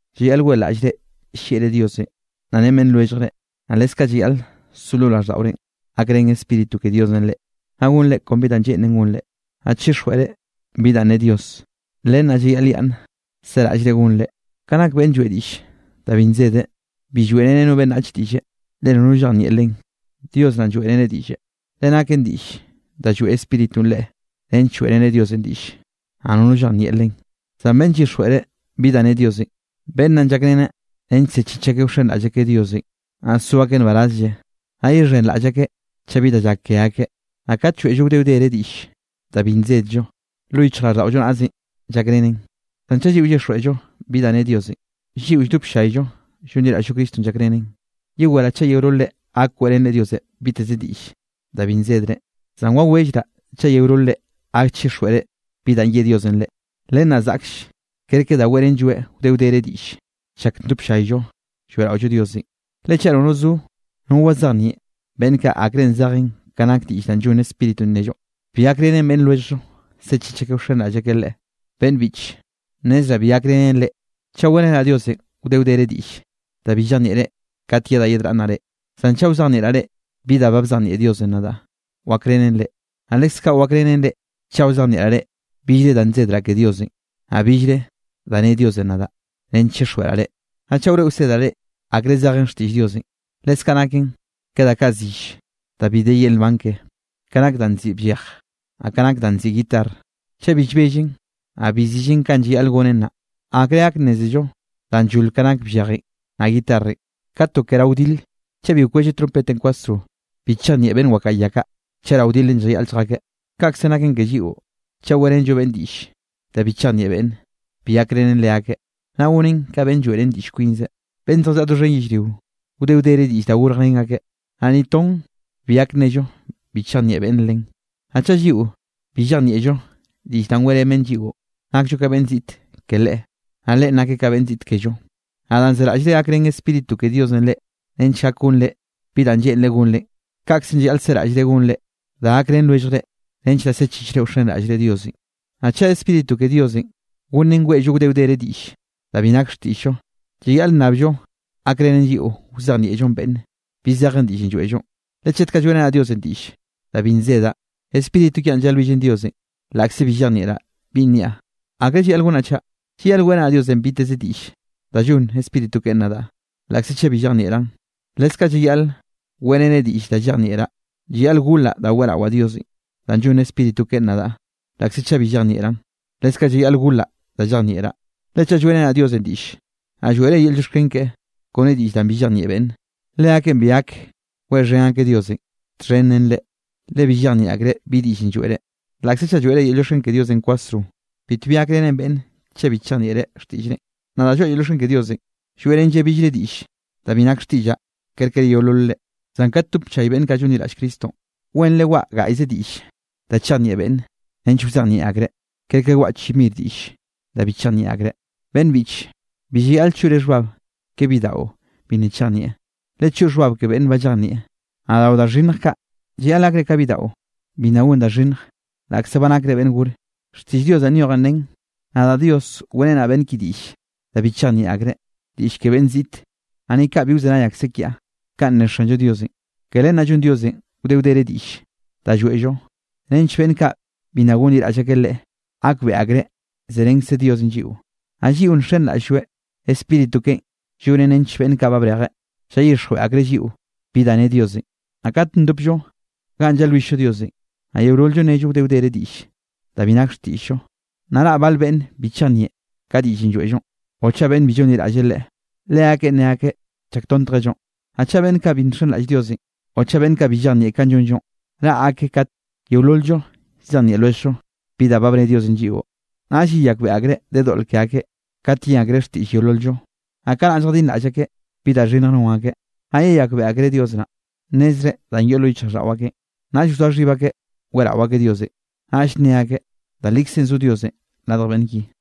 Llayaꞌl weꞌlaꞌllre llieꞌre Diosenꞌ naꞌ ren beꞌnn lwelljre, naꞌ leskaꞌ llayaꞌl so lo raꞌlldaꞌorenꞌ gakrén Spíritu ke Diosenꞌ reꞌ, naꞌ gonre kon bi da lleꞌnen gonre, naꞌ chixjweꞌre bi danꞌ ne Dios. Len naꞌ llayaꞌlyaꞌnn seraꞌllre gonre. Ka nak beꞌnn lloeꞌ diꞌll da bi nsedeꞌ, bi lloeꞌreneꞌ no beꞌnnach diꞌlle, le nono llejnieꞌ len, Dios naꞌn lloeꞌreneꞌ diꞌlle. Le naken diꞌll da lloeꞌ Spíritunꞌ leꞌe nench lloeꞌreneꞌ Diosenꞌ diꞌll, naꞌ nono llejnieꞌ len. Zan beꞌnn llyixjweꞌre bi danꞌ ne Diosenꞌ, beꞌnn naꞌn llakreneꞌ nench sechich akeꞌ wxenraꞌll akeꞌ Diosenꞌ, naꞌ so akeꞌ nbarazlle, naꞌ yexhenraꞌll akeꞌ chaꞌ bi da llak ke akeꞌ. Naꞌ kat lloeꞌllo wde wdere diꞌll da bi nsedllo, lo yichjraꞌlldaꞌollo naꞌzenꞌ llakrenen. Zan chaꞌ llyixjweꞌllo bi da nne Diosenꞌ, lliꞌo lldop ll-llayllo llonliraꞌll-llo Cristonꞌ llakrenen. Yeweraꞌ chaꞌ yeololre gak weꞌrenre Diosenꞌ biteze diꞌll da bi nsedre, zan wawellraꞌ chaꞌ yeololre gak chixjweꞌre bi da ye Diosenꞌ reꞌ. Len naꞌ zaꞌkll kerke da weꞌrenlloeꞌ wde wdere diꞌll chak ndop llayllo lloeꞌraollo Diosenꞌ. Le chaꞌ nono zo, no wazejnieꞌ beꞌnn kaꞌ akre zejen ka nak diꞌll danꞌ llonn Spíritunꞌ nnello, bi gakrenen beꞌnn lwelljllo sechich akeꞌ wxenraꞌll akeꞌ Leꞌe. Beꞌnn biꞌche, nnezraꞌ bi gakrenen reꞌ chaꞌ weꞌrenaꞌ Diosenꞌ wde wdere diꞌll da bi llejnieꞌre kat yedaꞌ yedraꞌnnaꞌ reꞌ. Zan chaꞌ wzejnieꞌraꞌ reꞌ bi danꞌ ba bzejnieꞌ Diosenꞌ nadaꞌ, wakrenen reꞌ. Naꞌ leskaꞌ wakrenen reꞌ chaꞌ wzejnieꞌraꞌ reꞌ billre da nnezraꞌ ke Diosenꞌ, naꞌ billre da ne Diosenꞌ nadaꞌ nench chixjweꞌraꞌ reꞌ, naꞌ chaꞌ wroeꞌ wsedraꞌ reꞌ, akre zeje xtiꞌll Diosenꞌ. Leskaꞌ naken ke da kaꞌ zill, da bi de yel nban ke, ka nak danꞌ nziꞌi bllej, naꞌ ka nak danꞌ nziꞌi guitarr, chaꞌ bi llbellen, naꞌ bi zillen kanꞌ llayaꞌl gonen naꞌ, ¿akre gak nnézello danꞌ llol ka nak bllejenꞌ naꞌ guitarrenꞌ? Ka to ke rao wdile, chaꞌ bi wkwelleꞌ trompetenꞌ kwasro, bi chejnieꞌ beꞌnn wakaꞌa ya kaꞌ, chaꞌ rao wdilenꞌ llayaꞌl lljakeꞌ. Kaꞌkzenꞌ naken ke lliꞌo, chaꞌ weꞌrenllo beꞌnne diꞌll da bi chejnieꞌ beꞌnne, bi gakrenen leakeꞌ, naꞌ gonen ka beꞌnn lloeꞌrén diꞌll kwinzeꞌ. Beꞌnn zjallaꞌa doxhen yellrio, wde wdere diꞌll da gorjrén akeꞌ. Naꞌ ni ton bi gak nnello bi chejnieꞌ beꞌnne len. Naꞌ chaꞌ lliꞌo bi llejnieꞌllo diꞌll da weꞌrén beꞌnn lliꞌo, nakllo ka beꞌnn ziꞌt ke leꞌe, naꞌ leꞌen nakeꞌ ka beꞌnn ziꞌt kello. Naꞌ danꞌ zeraꞌllre gakrén Spíritu ke Diosenꞌ reꞌ nench gak gonre bi da lleꞌnreꞌ gonre, kaꞌkzenꞌ llayaꞌl seraꞌllre gonneꞌ reꞌ da gakrén lwelljre nench naꞌ sechichre wxenraꞌllre Diosenꞌ. Naꞌ chaꞌ Spíritu ke Diosenꞌ gonen weꞌllo wde wdere diꞌll da bi nak xtiꞌll-llo, llayaꞌl nnabllo gakrenen lliꞌo wazejnieꞌllo beꞌnne bi zeje diꞌllenꞌ lloeꞌllo. Le chet kaꞌ lloeꞌrenaꞌ Diosenꞌ diꞌll da bi nsedaꞌ, spíritu kiaꞌn llalwillen Diosenꞌ, laꞌkze bi llejnieꞌraꞌ binꞌ niaꞌ. ¿Akre llayaꞌl gonaꞌ chaꞌ? Llayaꞌl weꞌrenaꞌ Diosenꞌ biteze diꞌll da llonn Spíritu keꞌen nadaꞌ, laꞌkze chaꞌ bi llejnieꞌraꞌn, leskaꞌ llayaꞌl weꞌreneꞌ diꞌll da llejnieꞌraꞌ. Llayaꞌl golaꞌ da weꞌrawaꞌ Diosenꞌ da llonn Spíritu keꞌen nadaꞌ, laꞌkze chaꞌ bi llejnieꞌraꞌn, leskaꞌ llayaꞌl golaꞌ da llejnieꞌraꞌ. Le chaꞌ lloeꞌrenre Diosenꞌ diꞌlle, naꞌ lloeꞌre yel llioxken keꞌe kone diꞌll danꞌ bi llejnieꞌ beꞌnne, leakeꞌn bi gak weꞌxhen akeꞌ Diosenꞌ txhen ren reꞌ, le bi llejnieꞌ akreꞌ bi diꞌllenꞌ lloeꞌre. Laꞌkze chaꞌ lloeꞌre yel llioxken ke Diosenꞌ kwasro, bitbi gakrenen beꞌnne chaꞌ bi chejnieꞌreꞌ xtiꞌllrenꞌ. Nadaꞌ lloaꞌa yel llioxken ke Diosenꞌ, lloeꞌrenlleꞌ billre diꞌll da bi nak xtiꞌllaꞌ kerke yeolol reꞌ. Zan kat ndop llay beꞌnn kaꞌ llonliraꞌll Cristonꞌ, wenre waꞌa gaꞌyze diꞌll da chejnieꞌ beꞌnne nench wzejnieꞌ akreꞌ, kerke waꞌa chi mir diꞌll da bi chejnieꞌ akreꞌ. Beꞌnn biꞌche, bi llayaꞌl choꞌre xhbab ke bidaꞌo bi nna chejnieꞌ, lechoꞌ xhbab ke beꞌnn ba llejnieꞌ. Naꞌ rao da xhinnj kaꞌ, llayaꞌl gakre ka bidaꞌo bi nna gon da xhinnj laꞌkze ba nakre beꞌnn gore. Xtiꞌll Dios danꞌ nyojen nen: “Nadaꞌ Dios weꞌrenaꞌ beꞌnn ki diꞌll da bi chejnieꞌ akreꞌ, diꞌll ke beꞌnn ziꞌte, naꞌ ni kaꞌ bi wzenay akseꞌ kiaꞌ.” Kaꞌn ne Xanllo Diosenꞌ. Ke len naꞌ llonn Diosenꞌ wde wdere diꞌll da lloeꞌllo nench beꞌnn kaꞌ bi nna gonliraꞌll akeꞌ Leꞌe gakbeꞌe akreꞌ zerenkze Diosenꞌ lliꞌo. Naꞌ lliꞌo nxenraꞌll-lloeꞌ, Spíritu keꞌen llonen nench beꞌnn kaꞌ ba brejeꞌ, llayixjweꞌ akreꞌ lliꞌo bi da ne Diosenꞌ. Naꞌ kat ndopllo ganꞌ llalwill-llo Diosenꞌ, naꞌ yeolol-llo nnello wde wdere diꞌll da bi nak xtiꞌll-llo, naꞌ raꞌ bal beꞌnne bi chejnieꞌ ka diꞌllenꞌ lloeꞌllonꞌ, o chaꞌ beꞌnn bi llonliraꞌll Leꞌe, leakeꞌn nne akeꞌ llaktontjellonꞌ. Naꞌ chaꞌ beꞌnn kaꞌ bi nxenraꞌll Diosenꞌ, o chaꞌ beꞌnn kaꞌ bi llejnieꞌ kanꞌ llonllonꞌ, raꞌ akeꞌ kate yeolol-llo llzejnieꞌ lwelljllo bi da ba bne Diosenꞌ lliꞌo, naꞌll yeyakbeꞌe akreꞌ de doꞌl ke akeꞌ kat yen akreꞌ xtiꞌll yeolol-llo, naꞌ kanaꞌ lljadinraꞌll akeꞌ bi da xhinnjenꞌ non akeꞌn. Naꞌ yeyakbeꞌe akreꞌ Dios naꞌ, nnezreꞌ danꞌ yoꞌ lo yichjraꞌlldaꞌo akeꞌn, naꞌll wzoa xhib akeꞌ weꞌrao akeꞌ Diosenꞌ, naꞌll nne akeꞌ: “Da likzenꞌ zo Diosenꞌ radj beꞌnn ki.”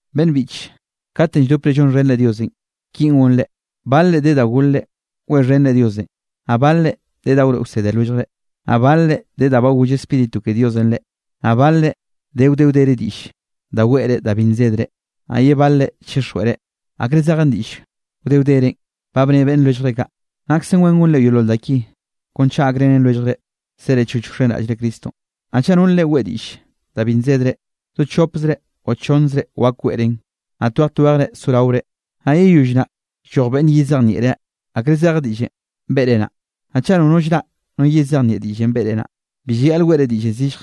Beꞌnn biꞌche, katenꞌ lldopre lloeꞌxhenre Diosenꞌ kinꞌ gonre: Balre de da golre weꞌxhenre Diosenꞌ, naꞌ balre de da wroeꞌ wsede lwelljre, naꞌ balre de da ba goll Spíritu ke Diosenꞌ reꞌ, naꞌ balre de wde wdere diꞌll da weꞌre da bi nsedre, naꞌ ye balre chixjweꞌre, akre zejen diꞌll wde wderenꞌ ba bne beꞌnn lwelljre kaꞌ. Naksen wen gonre yeolol da ki kon chaꞌ gakrenen lwelljre sere choch wxenraꞌllre Cristonꞌ. Naꞌ chaꞌ nolre weꞌe diꞌll danꞌ bi nsedre, do chopzre o chonnzre wak weꞌren, naꞌ twej twejre soraore, naꞌ yeyoll naꞌ lloj beꞌnne yezejnieꞌreꞌ akre zeje diꞌllenꞌ beꞌre naꞌ. Naꞌ chaꞌ nono llraꞌ no yezejnieꞌ diꞌllenꞌ beꞌre naꞌ, bi llayaꞌl weꞌre diꞌllenꞌ zillje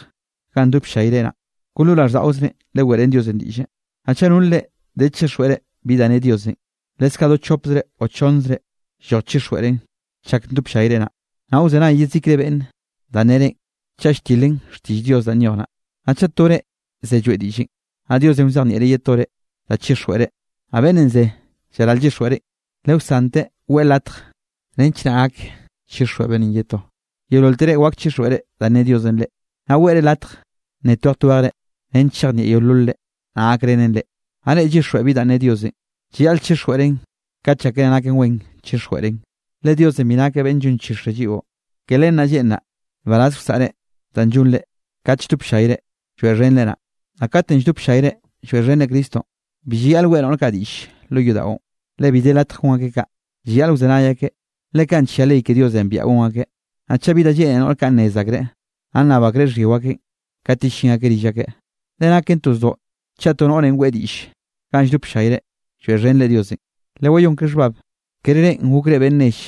ganꞌ ndop llayre naꞌ, kon lo raꞌlldaꞌozre leweꞌrén Diosenꞌ diꞌlle. Naꞌ chaꞌ nolre de chixjweꞌre bi da ne Diosenꞌ, leskaꞌ do chopzre o chonnzre lloj chixjweꞌren chak ndop llayre naꞌ, naꞌ wzenay yezikre beꞌnne danꞌ nnerenꞌ chaꞌ lltilen xtiꞌll Dios danꞌ nyoj naꞌ. Naꞌ chaꞌ tore ze lloeꞌ diꞌllenꞌ, naꞌ Diosenꞌ wzejnieꞌreꞌ ye tore da chixjweꞌreꞌ, naꞌ beꞌnnenꞌ ze llaral llyixjweꞌreꞌn, le wsanteꞌ weꞌe latj nench naꞌ gak chixjweꞌ beꞌnnenꞌ ye to. Yeololtere wak chixjweꞌre danꞌ ne Diosenꞌ reꞌ, naꞌ weꞌre latj nne twej twejre nench chejnieꞌ yeololre, naꞌ gakrenen reꞌ. Naꞌ reꞌ llyixjweꞌ bi danꞌ ne Diosenꞌ, llayaꞌl chixjweꞌren kat llákere naken wen chixjweꞌren. Le Diosenꞌ bi nakeꞌ beꞌnn llonchixreꞌ lliꞌo, ke len naꞌ lleꞌnreꞌ nbaraz wsaꞌre danꞌ llonre kat lldop ll-llayre lloeꞌxhenreꞌ naꞌ. Naꞌ katenꞌ lldop ll-llayre lloeꞌxhenre Cristonꞌ, bi llayaꞌl weꞌe noꞌr kaꞌ diꞌll lo yodaꞌon, le bi de latj gon akeꞌ kaꞌ, llayaꞌl wzenay akeꞌ, le kaꞌn nllia ley ke Diosenꞌ biaꞌa gon akeꞌ. Naꞌ chaꞌ bi da lleꞌne noꞌr kaꞌ nnez akreꞌ, naꞌ nnab akreꞌ xhyio akeꞌn kat yellín akeꞌ rill akeꞌ, le naken to zdoꞌ chaꞌ to noꞌre weꞌe diꞌll ganꞌ lldop ll-llayre lloeꞌxhenre Diosenꞌ. Lewayón ke xhbab, kere reꞌn gokre beꞌnn nell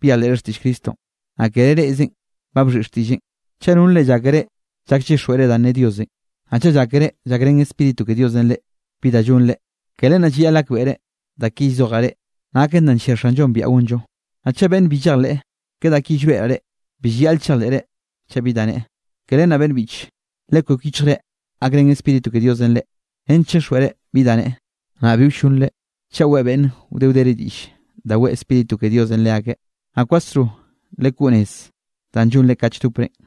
byejleꞌre xtiꞌll Cristonꞌ, naꞌ kere reꞌzenꞌ ba bxhiꞌi xtiꞌlleꞌn. Chaꞌ nolre llákere llak llyixjweꞌre danꞌ ne Diosenꞌ, naꞌ chaꞌ llákere llakrén Spíritu ke Diosenꞌ reꞌ bi da llonre, ke len naꞌ llayaꞌl gakbeꞌre da ki llzojaꞌ reꞌ naken da nllia Xanllonꞌ biaꞌa gonllo. Naꞌ chaꞌ beꞌnn bi llejleꞌ ke da ki llroeꞌraꞌ reꞌ, bi llayaꞌl chejleꞌre chaꞌ bi da neꞌe. Ke len naꞌ beꞌnn biꞌche, lekwek yichjre gakrén Spíritu ke Diosenꞌ reꞌ nench chixjweꞌre bi da nneꞌe, naꞌ bi wllonre chaꞌ weꞌe beꞌnne wde wdere diꞌll da weꞌe Spíritu ke Diosenꞌ leakeꞌ. Naꞌ kwasro lekoꞌ nez danꞌ llonre kat lldoprenꞌ.